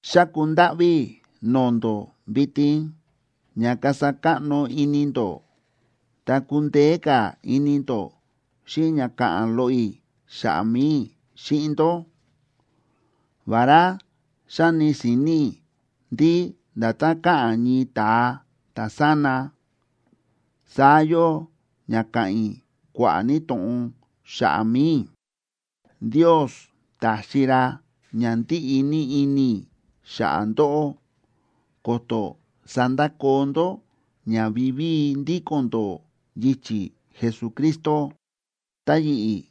Xáku ndáꞌví i̱ no̱o̱ ndó vitin ña kasa káꞌno ini ndó ta kundeé ka̱ ini ndó xíꞌin ña ka̱ꞌa̱n loꞌo i̱ xa̱ꞌa̱ mi̱i i̱ xíꞌin ndó, vará xáni si̱ni̱ i̱ ndí nda̱tán káꞌa̱n ñii ta̱a ta̱sána, saá yóo ña káꞌa̱n i̱ kua̱ꞌa̱ ní to̱ꞌon xa̱ꞌa̱ mi̱i i̱. Ndios ta̱xi ra ña ndíꞌi ní ini i̱ xa̱ꞌa̱ ndóꞌó ko̱to̱ sandakoo ndó ña vivíi ndíko̱n ndó yichi̱ Jesucristo. Ta yi̱ꞌi̱,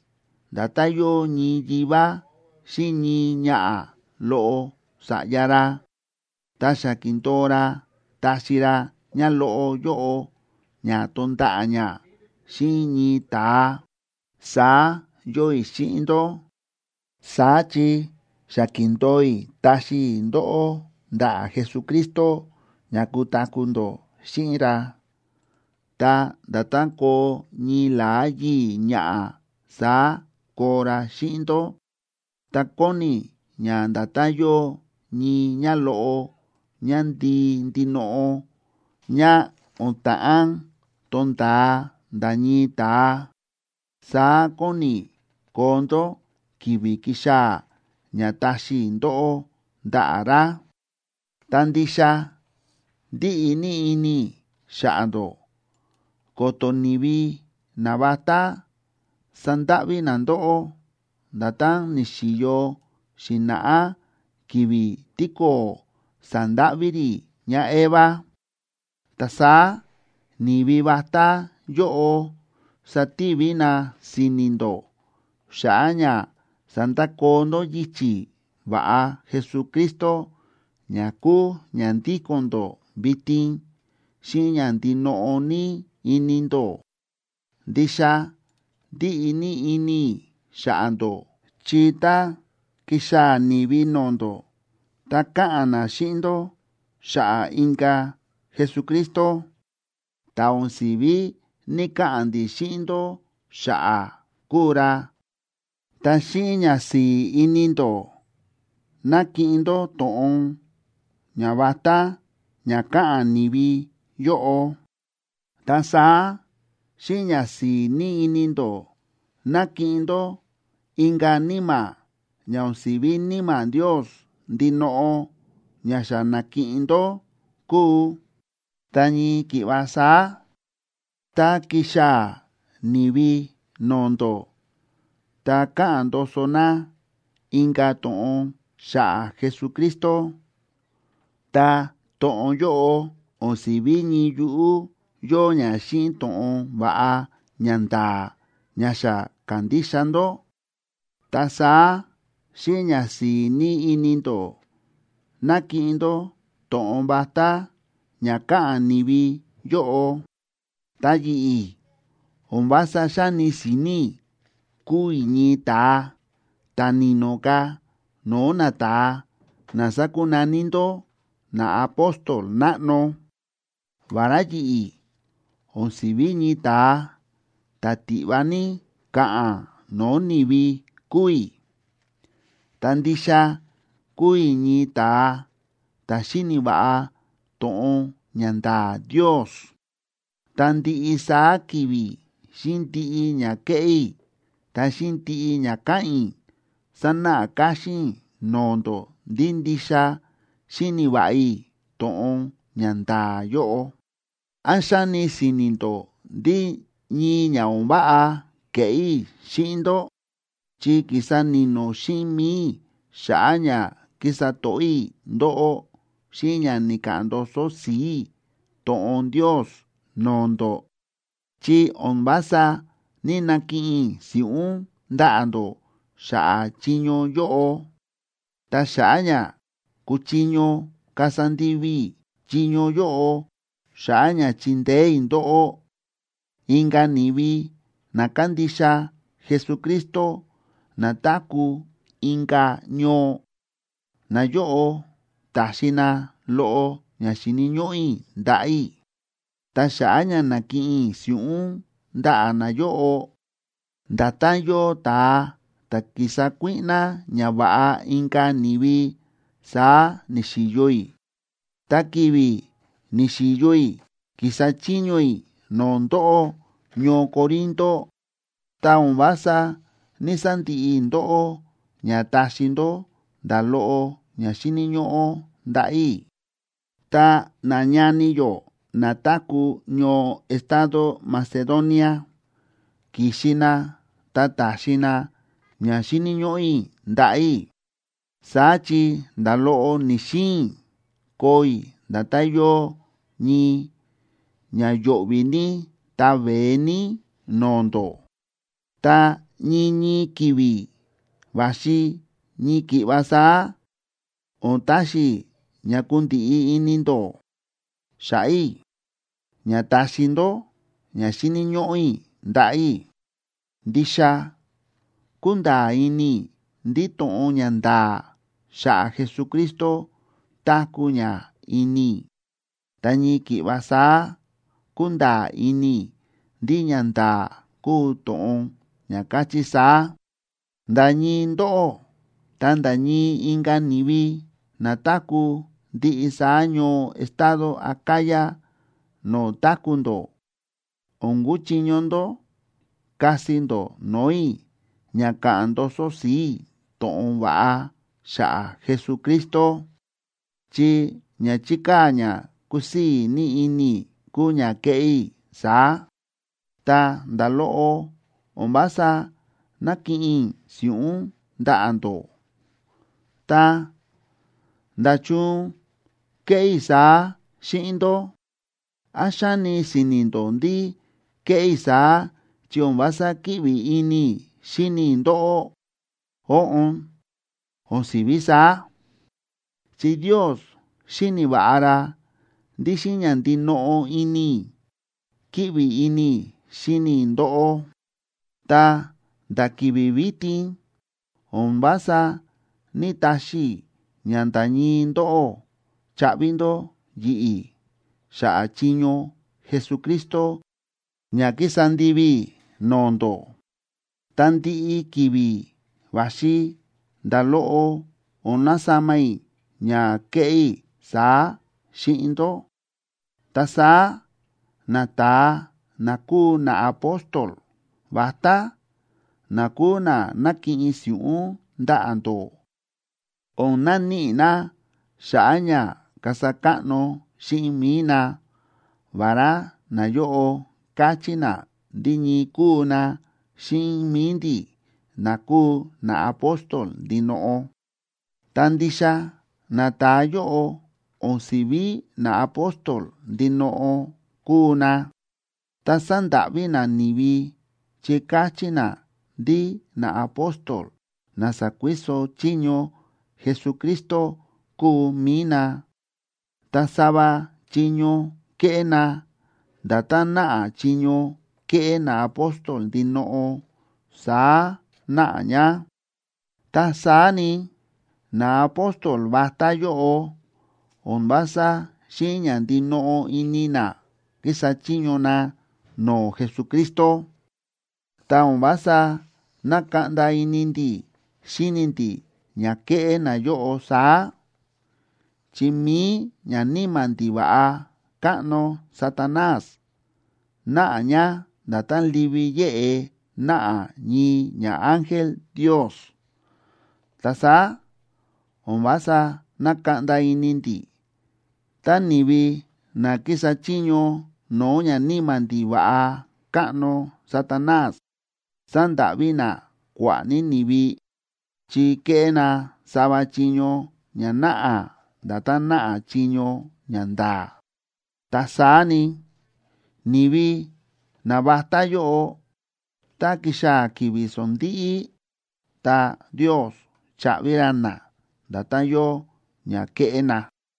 nda̱tán yóo ñii yivá xíꞌin ñii ñaꞌa̱ loꞌo sa̱ꞌya ra, ta xa ki̱ndo̱o ra taxi ra ñáloꞌo yóꞌo ña tonda̱ꞌa̱ ñá xíꞌin ñii ta̱a, saá yóo i̱ xíꞌin ndó. Saá chi xa ki̱ndo̱o i̱ taxi i̱ ndóꞌó ndaꞌa̱ Jesucristo ña kutaku̱ ndó xíꞌin ra, ta nda̱tán koo ñii la̱á yii̱ ñaꞌa̱ saá koo ra xíꞌin ndó. Ta kóni i̱ ña nda̱tán yóo ñii ñáloꞌo ñándii ndinoꞌo ñá o̱n ta̱ꞌán tonda̱a nda̱ ñii ta̱a, saá kóni i̱ koo ndó ki̱vi̱ kixaa̱ ña taxi i̱ ndóꞌó ndaꞌa̱ ra. Ta ndixa ndíꞌi ní ini i̱ xa̱ꞌa̱ ndó ko̱to̱ ni̱vi navatá sandáꞌví na ndóꞌó, nda̱tán ni̱xi̱yo xi̱na̱ꞌá ki̱vi̱ tíko̱o̱ sa̱ndáꞌví rí ñáEva. Ta saá ni̱vi vatá yóꞌo sativi na si̱ni̱ ndó xa̱ꞌa̱ ña sandakoo ndó yichi̱ va̱ꞌa Jesucristo ña kúu ña ndíko̱n ndó vitin xíꞌin ña ndinoꞌo ní ini ndó. Ndixa ndíꞌi ní ini i̱ xa̱ꞌa̱ ndó, chi tá kíxaa̱ ni̱vi no̱o̱ ndó ta káꞌa̱n na xíꞌin ndó xa̱ꞌa̱ inka̱ Jesucristo ta̱ o̱n si̱ví ní‑kaꞌa̱n ndi̱ xíꞌin ndó xa̱ꞌa̱ kúu ra, ta xíꞌin ñasi̱i̱ ini ndó nákiꞌin ndó to̱ꞌon ñavatá ña káꞌa̱n ni̱vi yóꞌo. Ta saá xíꞌin ñasi̱i̱ ní ini ndó nákiꞌin ndó inka̱ níma̱ ña o̱n si̱ví Níma̱ Ndios ndinoꞌo ña xa na̱kiꞌin ndó kúu. Ta ñii ki̱ꞌva saá, tá kíxaa̱ ni̱vi no̱o̱ ndó ta káꞌa̱n ndoso na inka̱ to̱ꞌon xa̱ꞌa̱ Jesucristo, ta to̱ꞌon yóꞌo o̱n si̱ví ñii yuꞌú yóo ña xíꞌin to̱ꞌon va̱ꞌa ñanda̱a̱ ña xa ka̱ndixa ndó, ta saá xíꞌin ñasi̱i̱ ní ini ndó nákiꞌin ndó to̱ꞌon vatá ña káꞌa̱n ni̱vi yóꞌo. Ta yi̱ꞌi̱, o̱n vása xáni si̱ni̱ i̱ kúu i̱ ñii ta̱a ta̱ ni̱no̱ ka̱ no̱o̱ nata̱a na sákunaní ndó “naapóstol náꞌno.” Vará yi̱ꞌi̱ o̱n si̱ví ñii ta̱a ta̱ tiꞌva ní ka̱ꞌa̱n no̱o̱ ni̱vi kúu i̱, ta ndixa kúu i̱ ñii ta̱a ta̱ xíni̱ va̱ꞌa to̱ꞌon ña nda̱a̱ Ndios. Ta ndiꞌi saá ki̱vi̱ xíꞌin ndiꞌi ña kéꞌé i̱ ta xíꞌin ndiꞌi ña káꞌa̱n i̱, sánáꞌa káxín i̱ no̱o̱ ndó ndí ndixa xíni̱ va̱ꞌa i̱ to̱ꞌon ña nda̱a̱ yóꞌo. ¿Án xáni si̱ni̱ ndó ndí ñii ña o̱n váꞌa ke̱ꞌé i̱ xíꞌin ndó?, chi ki̱sa ni̱no̱ xíꞌin mi̱i i̱ xa̱ꞌa̱ ña ki̱sa to̱ꞌó i̱ ndóꞌó xíꞌin ña ni̱ka̱ꞌa̱n ndoso si̱i̱ i̱ to̱ꞌon Ndios no̱o̱ ndó, chi o̱n vása ní‑nakiꞌin i̱ si̱ꞌún ndaꞌa̱ ndó xa̱ꞌa̱ chiño yóꞌo. Ta xa̱ꞌa̱ ña kuchiño kasa ndivi i̱ chiño yóꞌo xa̱ꞌa̱ ña chindeé i̱ ndóꞌó, inka̱ ni̱vi na kándixa Jesucristo na táku̱ inka̱ ñoo, nayóꞌo ta̱xi na loꞌo ña xíni̱ ñóꞌó i̱ ndaꞌa̱ i̱. Ta xa̱ꞌa̱ ña na̱kiꞌin i̱ si̱ꞌún ndaꞌa̱ nayóꞌo, nda̱tán yóo ta̱a ta̱ ki̱sa kuíꞌná ñava̱ꞌa inka̱ ni̱vi, saá ni̱xi̱yo i̱. Ta ki̱vi̱ ni̱xi̱yo i̱ ki̱sa chiño i̱ no̱o̱ ndóꞌó ñoo Corinto, ta o̱n vása ní‑sandiꞌi i̱ ndóꞌó ña taxi ndó nda̱ loꞌo ña xíni̱ ñóꞌó ndaꞌa̱ i̱. Ta nañani yó na táku̱ ñoo estado Macedonia, ki̱xi na ta ta̱xi na ña xíni̱ ñóꞌó i̱ ndaꞌa̱ i̱. Saá chi nda̱ loꞌo ni̱‑xiin i̱ koo i̱ nda̱tán yóo ñii ña yo̱ꞌvi̱ ní ta veé ní no̱o̱ ndó. Ta ñii ñii ki̱vi̱ va̱xi ñii ki̱ꞌva saá o̱n taxi i̱ ña kundiꞌi ini ndó xa̱ꞌa̱ i̱ ña taxi ndó ña xíni̱ ñóꞌó i̱ ndaꞌa̱ i̱. Ndixa kúnda̱a̱ ini i̱ ndí to̱ꞌon ña nda̱a̱ xa̱ꞌa̱ Jesucristo táku̱ ña ini i̱, ta ñii ki̱ꞌva saá kúnda̱a̱ ini i̱ ndí ñanda̱a̱ kúu to̱ꞌon ña káchí saá: nda̱ ñii ndóꞌó ta nda̱ ñii inka̱ ni̱vi na táku̱ ndiꞌi saá ñoo estado Acaya no̱o̱ táku̱ ndó, o̱n kuchiño ndó kasi ndó no̱o̱ i̱ ña ka̱ꞌa̱n ndoso si̱i̱ i̱ to̱ꞌon va̱ꞌa xa̱ꞌa̱ Jesucristo, chi ña chíkaa̱ ña kúsii̱ ní ini i̱ kúu ña kéꞌé i̱ saá, ta nda̱ loꞌo o̱n vása nákiꞌin i̱ si̱ꞌún ndaꞌa̱ ndó. Ta, ¿nda̱chun kéꞌé i̱ saá xíꞌin ndó? ¿Án xáni si̱ni̱ ndó ndí kéꞌé i̱ saá, chi o̱n vása kíꞌvi ini i̱ xíni i̱ ndóꞌó? Óꞌon, o̱n si̱ví saá. Chi Ndios xíni̱ va̱ꞌa ra ndí xíꞌin ña ndinoꞌo ini i̱ kíꞌvi ini i̱ xíni i̱ ndóꞌó. Ta nda̱ ki̱vi̱ vitin o̱n vása ní‑taxi i̱ ña nda̱ ñii ndóꞌó chaꞌvi ndó yi̱ꞌi̱ xa̱ꞌa̱ chiño Jesucristo ña kísa ndivi i̱ no̱o̱ ndó. Ta ndiꞌi ki̱vi̱ va̱xi nda̱ loꞌo o̱n nasama i̱ ña kéꞌé i̱ saá xíꞌin ndó. Ta saá nata̱a na kúu naapóstol vatá, na kúu na nákiꞌin si̱ꞌún ndaꞌa̱ ndó, o̱n naníꞌi na xa̱ꞌa̱ ña kasa káꞌno xíꞌin mi̱i na, vará nayóꞌo káchí na ndí ñii kúu na xíꞌin mi̱i ndi̱, na kúu naapóstol ndinoꞌo. Ta ndixa nata̱a yóꞌo o̱n si̱ví naapóstol ndinoꞌo kúu na, ta sándáꞌví na ni̱vi chi káchí na ndí naapóstol na sa̱kuiso chiño Jesucristo kúu mi̱i na. Ta sava chiño kéꞌé na, nda̱tán náꞌa chiño kéꞌé naapóstol ndinoꞌo saá náꞌa ña. Ta saá ni, naapóstol vatá yóꞌo o̱n vása xíꞌin ña ndinoꞌo ini na kísa chiño na no̱o̱ Jesucristo. Ta o̱n vása nákaꞌnda ini ndi̱ xíni ndi̱ ña kéꞌé nayóꞌo saá, chi mi̱i ñaníma̱ ndiva̱ꞌa káꞌno Satanás náꞌa ña nda̱tán livi yéꞌe náꞌa ñii ñaángel Ndios. Ta saá o̱n vása nákaꞌnda ini ndi̱ tá ni̱vi na kísa chiño no̱o̱ ñaníma̱ ndiva̱ꞌa káꞌno Satanás sándáꞌví na kua̱ꞌa̱ ní ni̱vi, chi kéꞌé na sava chiño ña náꞌa nda̱tán náꞌa chiño ña nda̱a̱. Ta saá ni, ni̱vi navatá yóꞌo, tá kixaa̱ ki̱vi̱ sondíꞌí, ta Ndios chaꞌvi ra na nda̱tán yóo ña kéꞌé na.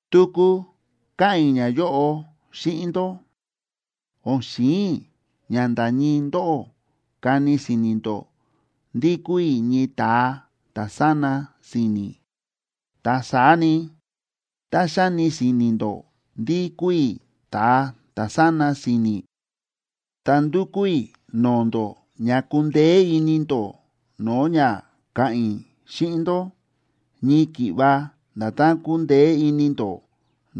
Tuku káꞌa̱n i̱ ñayóꞌo xíꞌin ndó: O̱n xi̱in i̱ ña nda̱ ñii ndóꞌó kani si̱ni̱ ndó ndí kúu i̱ ñii ta̱a ta̱ sána si̱ni̱. Ta saá ni, tá xáni si̱ni̱ ndó ndí kúu i̱ ta̱a ta̱ sána si̱ni̱, ta ndúkú i̱ no̱o̱ ndó ña kundeé ini ndó no̱o̱ ña ka̱ꞌa̱n i̱ xíꞌin ndó ñii ki̱ꞌva nda̱tán kundeé ini ndó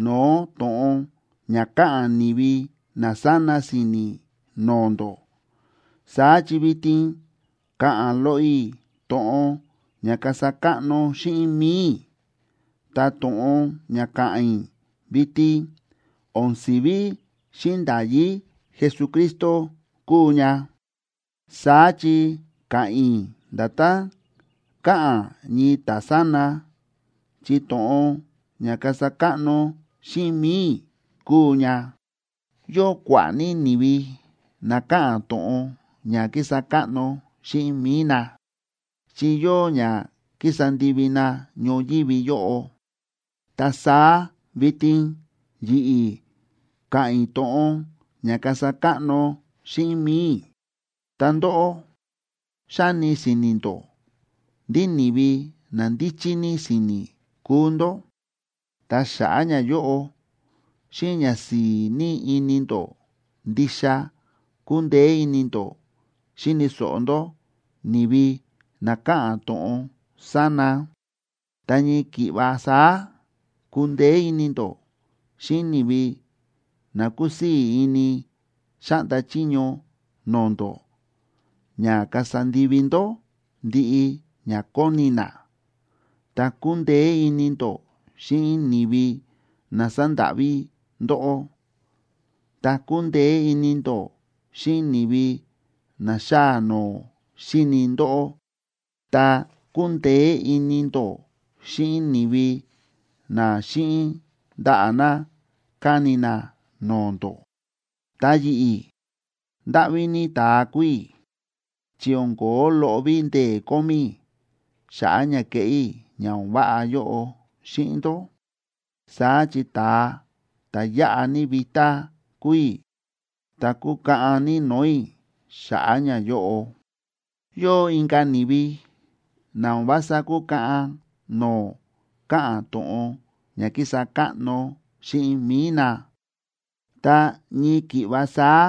no̱o̱ to̱ꞌon ña káꞌa̱n ni̱vi na sána si̱ni̱ no̱o̱ ndó. Saá chi vitin ka̱ꞌa̱n loꞌo i̱ to̱ꞌon ña kasa káꞌno xíꞌin mi̱i i̱. Ta to̱ꞌon ña ka̱ꞌa̱n i̱ vitin o̱n si̱ví xíꞌin nda̱yí Jesucristo kuu ña, saá chi ka̱ꞌa̱n i̱ nda̱tán káꞌa̱n ñii ta̱sána, chi to̱ꞌon ña kasa káꞌno xíꞌin mi̱i i̱ kuu ña. Yóo kua̱ꞌa̱ ní ni̱vi na káꞌa̱n to̱ꞌon ña kísa káꞌno xíꞌin mi̱i na, chi yóo ña ki̱sa ndivi na ñoyívi yóꞌo, ta saá vitin yi̱ꞌi̱ ka̱ꞌa̱n i̱ to̱ꞌon ña kasa káꞌno xíꞌin mi̱i i̱. Ta ndóꞌó, xáni si̱ni̱ ndó ndí ni̱vi na ndíchí ní si̱ni̱ kúu ndó. Ta xa̱ꞌa̱ ñayóꞌo, xíꞌin ñasi̱i̱ ní ini ndó ndixa kúndeé ini ndó xíni̱ so̱ꞌo ndó ni̱vi na káꞌa̱n to̱ꞌon sána. Ta ñii ki̱ꞌva saá kúndeé ini ndó xíꞌin ni̱vi na kúsii̱ ini xáꞌnda chiño no̱o̱ ndó ña kasa ndivi ndó ndiꞌi ña kóni na, ta kúndeé ini ndó xíꞌin ni̱vi na sándáꞌví ndóꞌó, ta kúndeé ini ndó xíꞌin ni̱vi na xáa noo xíni ndóꞌó, ta kúndeé ini ndó xíꞌin ni̱vi na xíꞌin ndaꞌa̱ na, káni na no̱o̱ ndó. Ta yi̱ꞌi̱, ¡ndáꞌví ní ta̱a kúu i̱!, chi o̱n ko̱ó loꞌo ví ndee̱ kómí i̱ xa̱ꞌa̱ ña keꞌé i̱ ña o̱n váꞌa yóꞌo xíꞌin ndó. Saá chi ta̱a ta̱ yáꞌa ní vitá kúu i̱, ta kúkaꞌan ní no̱o̱ i̱ xa̱ꞌa̱ ñayóꞌo. Yóo inka̱ ni̱vi na o̱n vása kúkaꞌan no̱o̱ káꞌa̱n to̱ꞌon ña kísa káꞌno xíꞌin mi̱i na, ta ñii ki̱ꞌva saá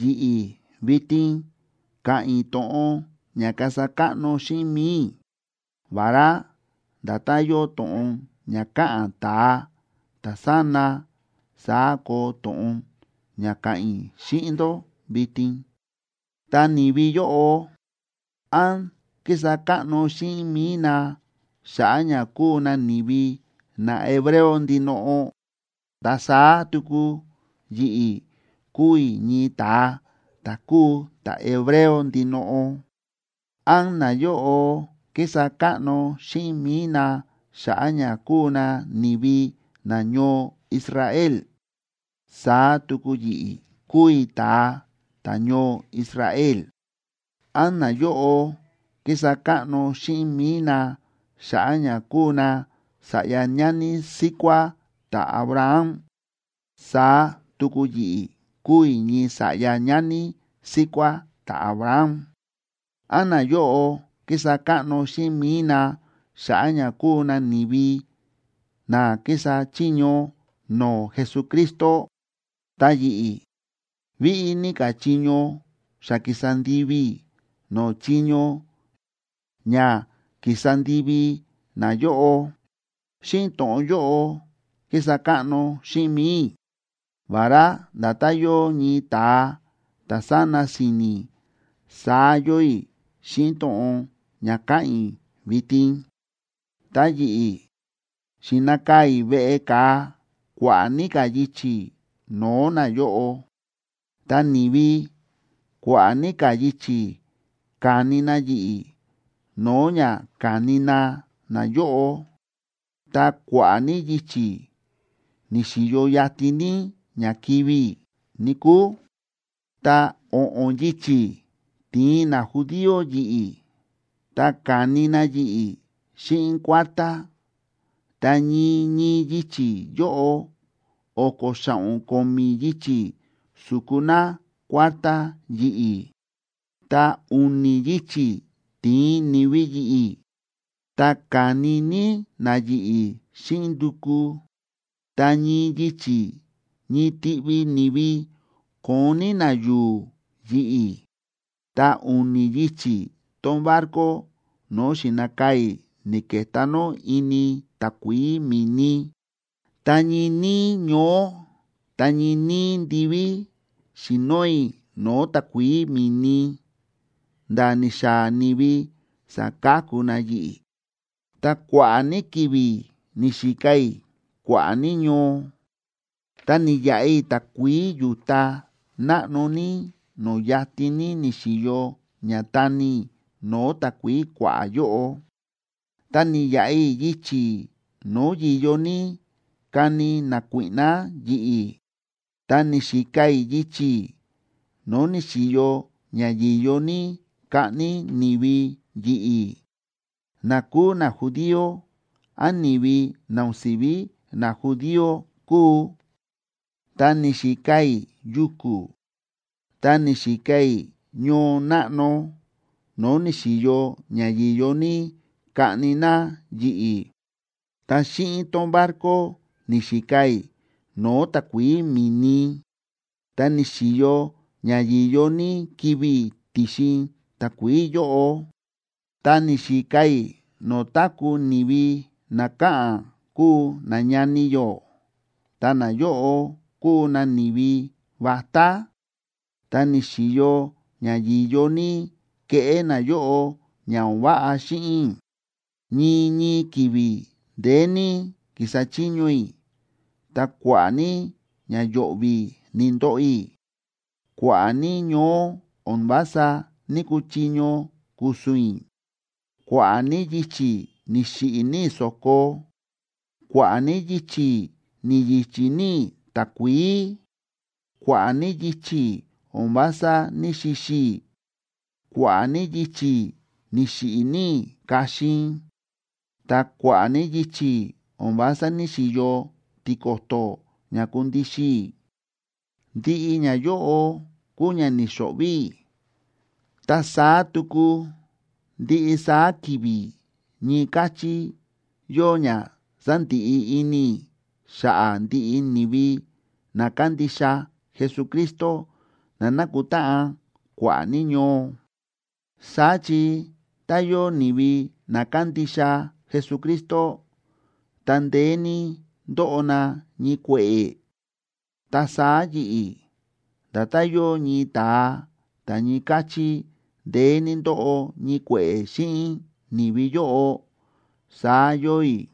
yi̱ꞌi̱ vitin ka̱ꞌa̱n i̱ to̱ꞌon ña kasa káꞌno xíꞌin mi̱i i̱, vará nda̱tán yóo to̱ꞌon ña káꞌa̱n ta̱a ta̱sána saá koo to̱ꞌon ña ka̱ꞌa̱n i̱ xíꞌin ndó vitin. Ta ni̱vi yóꞌo, ¿án kísa káꞌno xíꞌin mi̱i na xa̱ꞌa̱ ña kúu na ni̱vi nahebreo ndinoꞌo? Ta saá tuku yi̱ꞌi̱ kúu i̱ ñii ta̱a ta̱ kúu ta̱hebreo ndinoꞌo. ¿Án nayóꞌo kísa káꞌno xíꞌin mi̱i na xa̱ꞌa̱ ña kúu na ni̱vi nañoo Israel? Saá tuku yi̱ꞌi̱ kúu i̱ ta̱a ta̱ñoo Israel. ¿Án nayóꞌo kísa káꞌno xíꞌin mi̱i na xa̱ꞌa̱ ña kúu na sa̱ꞌya ñani síkuá ta̱Abraham? Saá tuku yi̱ꞌi̱ kúu i̱ ñii sa̱ꞌya ñani síkuá ta̱Abraham. ¿Án nayóꞌo kísa káꞌno xíꞌin mi̱i na xa̱ꞌa̱ ña kúu na ni̱vi na kísa chiño no̱o̱ Jesucristo? Ta yi̱ꞌi̱, víꞌí ní ka̱ chiño xa ki̱sa ndivi i̱ no̱o̱ chiño ña ki̱sa ndivi nayóꞌo. (Xíꞌin to̱ꞌon yóꞌo kísa káꞌno xíꞌin mi̱i i̱, vará nda̱tán yóo ñii ta̱a ta̱ sána si̱ni̱, saá yóo i̱ xíꞌin to̱ꞌon ña káꞌa̱n i̱ vitin.) Ta yi̱ꞌi̱, xi̱nakaa̱ i̱ veꞌe ka̱a kua̱ꞌa̱ ní ka̱ yichi̱ no̱o̱ nayóꞌo; ta ni̱vi kua̱ꞌa̱ ní ka̱ yichi̱ ka̱ni ní na yi̱ꞌi̱ no̱o̱ ña ka̱ni na nayóꞌo; ta kua̱ꞌa̱ ní yichi̱ ni̱xi̱yo yatin ní ña kivi̱ i̱, níkúu. Ta o̱ꞌo̱n yichi̱ ti̱in najudío yi̱ꞌi̱, ta ka̱ni na yi̱ꞌi̱ xíꞌin kuártá, ta ñii ñii yichi̱ yóꞌo o̱ko̱ xa̱ꞌo̱n ko̱mi̱ yichi̱ su̱ku na kuártá yi̱ꞌi̱. Ta u̱ni̱ yichi̱ ti̱in ni̱vi yi̱ꞌi̱, ta ka̱ni ní na yi̱ꞌi̱ xíꞌin nduku, ta ñii yichi̱ ñii tiꞌvi ni̱vi ko̱on ní na yu̱u̱ yi̱ꞌi̱. Ta u̱ni̱ yichi̱ tón barco no̱o̱ xi̱nakaa̱ i̱ ni̱ke̱tá nó ini takuií mi̱ni. Ta ñii níí ñoó ta ñii níí ndiví xi̱noo i̱ no̱o̱ takuií mi̱ni nda̱ ni̱xaa̱ ni̱vi sa̱ka̱ku na yi̱ꞌi̱. Ta kua̱ꞌa̱ ní ki̱vi̱ ni̱xika i̱ kua̱ꞌa̱ ní ñoo, ta ni̱yaꞌa i̱ takuií yu̱ta náꞌno ní no̱o̱ yatin ní ni̱xi̱yo ña tani i̱ no̱o̱ takuií kua̱ꞌa̱ yóꞌo. Ta ni̱yaꞌa i̱ yichi̱ no̱o̱ yi̱yo ní kani nakuíꞌná yi̱ꞌi̱, ta ni̱xika i̱ yichi̱ no̱o̱ ni̱xi̱yo ña yi̱yo ní kaꞌni ni̱vi yi̱ꞌi̱, na kúu najudío án ni̱vi na o̱n si̱ví najudío kúu. Ta ni̱xika i̱ yuku̱ ta ni̱xika i̱ ñoo náꞌno no̱o̱ ni̱xi̱yo ña yi̱yo ní kaꞌni na yi̱ꞌi̱. Ta xíꞌin tón barco ni̱xika i̱ no̱o̱ takuií mi̱ni, ta ni̱xi̱yo ña yi̱yo ní kivi̱ i̱ ti̱xin takuií yóꞌo. Ta ni̱xika i̱ no̱o̱ táku̱ ni̱vi na káꞌa̱n kúu nañani yó, ta nayóꞌo kúu na ni̱vi vatá, ta ni̱xi̱yo ña yi̱yo ní keꞌé nayóꞌo ña o̱n váꞌa xíꞌin i̱. Ñii ñii ki̱vi̱ ndeé ní ki̱sa chiño i̱, ta kua̱ꞌa̱ ní ña yo̱ꞌvi̱ ni̱ndoꞌo i̱. Kua̱ꞌa̱ ní ñoó o̱n vása ní‑kuchiño ku̱su̱n i̱; kua̱ꞌa̱ ní yichi̱ ni̱xiꞌi̱ ní i̱ so̱ko; kua̱ꞌa̱ ní yichi̱ ni̱yi̱chi̱ ní i̱ takuií; kua̱ꞌa̱ ní yichi̱ o̱n vása ní‑xixi i̱; kua̱ꞌa̱ ní yichi̱ ni̱xiꞌi̱ ní i̱ kaxin; ta kua̱ꞌa̱ ní yichi̱ o̱n vása ní‑xiyo tiko̱to̱ ña kundixin i̱. Ndiꞌi ñayóꞌo kúu ña ni̱xo̱ꞌvi̱ i̱, ta saá tuku ndiꞌi saá ki̱vi̱ ñii káchí yóo ña sándiꞌi ini i̱ xa̱ꞌa̱ ndiꞌi ni̱vi na kándixa Jesucristo na nákutáꞌan kua̱ꞌa̱ ní ñoo. Saá chi tá yóo ni̱vi na kándixa Jesucristo, ta ndeé ní ndóꞌo na ñii kue̱ꞌe̱, ta saá yi̱ꞌi̱ nda̱tán yóo ñii ta̱a ta̱ ñii káchí ndeé ní ndóꞌo ñii kue̱ꞌe̱ xíꞌin ni̱vi yóꞌo, saá yóo i̱,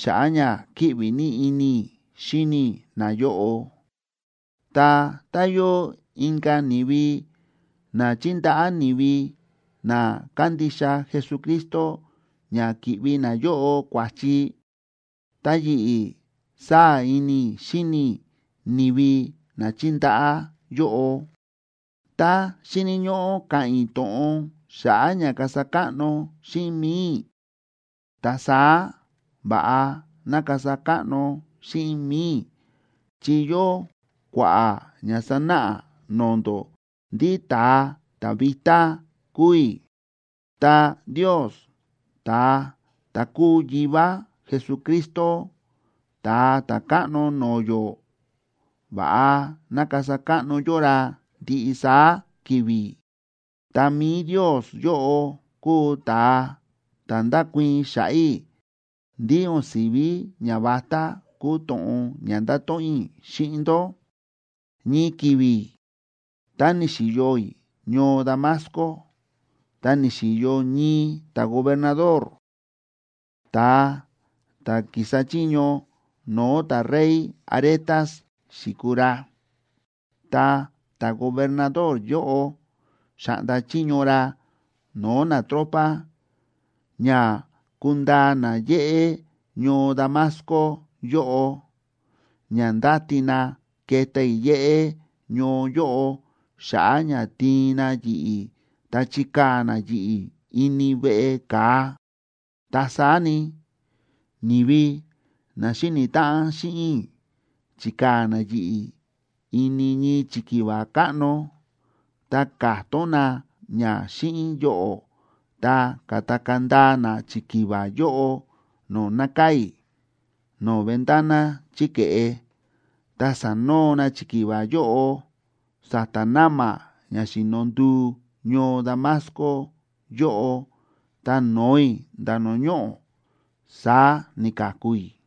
xa̱ꞌa̱ ña kíꞌvi ní ini i̱ xíni i̱ nayóꞌo. Ta tá yóo inka̱ ni̱vi na chíndaꞌá ni̱vi na kándixa Jesucristo ña ki̱ꞌvi nayóꞌo kua̱chi, ta yi̱ꞌi̱ sáa̱ ini i̱ xíni i̱ ni̱vi na chíndaꞌá yóꞌo. Tá xíni̱ ñóꞌó ka̱ꞌa̱n i̱ to̱ꞌon xa̱ꞌa̱ ña kasa káꞌno xíꞌin mi̱i i̱, ta saá va̱ꞌa ná kasa káꞌno xíꞌin mi̱i i̱ chi yóo kua̱ꞌa̱ ña sánáꞌa no̱o̱ ndó ndí ta̱a ta̱ vitá kúu i̱. Ta Ndios, ta̱a ta̱ kúu Yivá Jesucristo, Ta̱a Ta̱káꞌno no̱o̱ yó, va̱ꞌa ná kasa káꞌno yó ra ndiꞌi saá ki̱vi̱. Ta mi̱i Ndios yóꞌo kúu ta̱a ta̱ ndákuii̱n xa̱ꞌa̱ i̱ ndí o̱n si̱ví ñavatá kúu to̱ꞌon ña ndáto̱ꞌon i̱ xíꞌin ndó. Ñii ki̱vi̱ tá ni̱xi̱yo i̱ ñoo Damasco, ta ni̱xi̱yo ñii ta̱gobernador, ta̱a ta̱ ki̱sa chiño no̱o̱ ta̱rey Aretas xi̱kuu ra. Ta ta̱gobernador yóꞌo xa̱ꞌnda chiño ra no̱o̱ natropa ña kundaa na yéꞌé ñoo Damasco yóꞌo, ña ndáti na keta i̱ yéꞌé ñoo yóꞌo xa̱ꞌa̱ ña tiin na yi̱ꞌi̱ ta chikaa̱ na yi̱ꞌi̱ ini veꞌe ka̱a. Ta saá ni, ni̱vi na xíni̱ táꞌan xíꞌin i̱ chi̱kaa̱ na yi̱ꞌi̱ ini ñii chikiva káꞌno, ta ka̱tón na ña xíꞌin yoꞌo̱, ta ka̱takaa̱ ndaa na chikiva yóꞌo no̱o̱ nákaa̱ i̱, no̱o̱ ventana chí ke̱ꞌe, ta sa̱noo na chikiva yóꞌo sa̱ta̱ na̱ma̱ ña xi̱no nduu ñoo Damasco yóꞌo, ta no̱o i̱ nda̱ no̱o̱ ñoꞌo̱. Saá ni̱ka̱ku i̱.